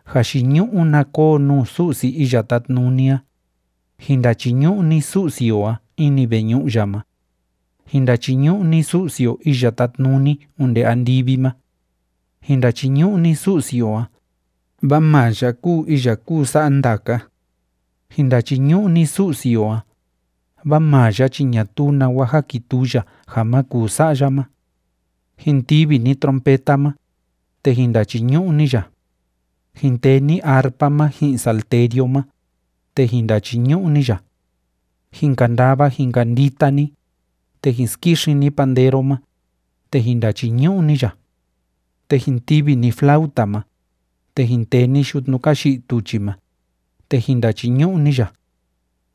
Jayiñu'u na koo nuu Su'si Iya Tátnuni a. Jin ndachiñu'u ni Su'si o a ini veñu'u ya ma. Jin ndachiñu'u ni Su'si o iya tátnuni onde andivi ma. Jin ndachiñu'u ni Su'si o a, vaa maa ya kúu iya kúu sa'a ndaka. Jin ndachiñu'u ni Su'si o a, vaa maa ya chi ñatuu nawa jákituu ya ja ma kuu sa'a ya ma. Jin tivi ni trompeta ma, te jin ndachiñu'u ni ya. Jin tee ni arpa ma ji'in salterio ma, te jin ndachiñu'u ni ya. Jin kandava jin kandita ni, te jin skixin ni pandero ma, te jin ndachiñu'u ni ya. Te jin tivi ni flauta ma, te jin tee ni yutnu ka yi'i tuchi ma, te jin ndachiñu'u ni ya.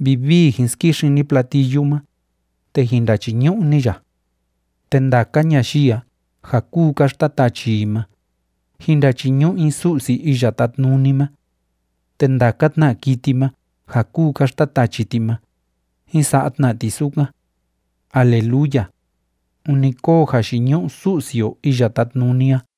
Vivii jin skixin ni platillu ma, te jin ndachiñu'u ni ya. Te ndaka ñayii a ja kúu ka xtatachi i ma, jín ndachiñu'u i Su'si Iya Tátnuni ma. Te ndaka tna kiti ma ja kúu ka xtatachi ti ma, jin sa'a tna ti sukan. ¡Aleluya! ¡Ûni kóo jayiñu'u Su'si o Iya Tátnuni a!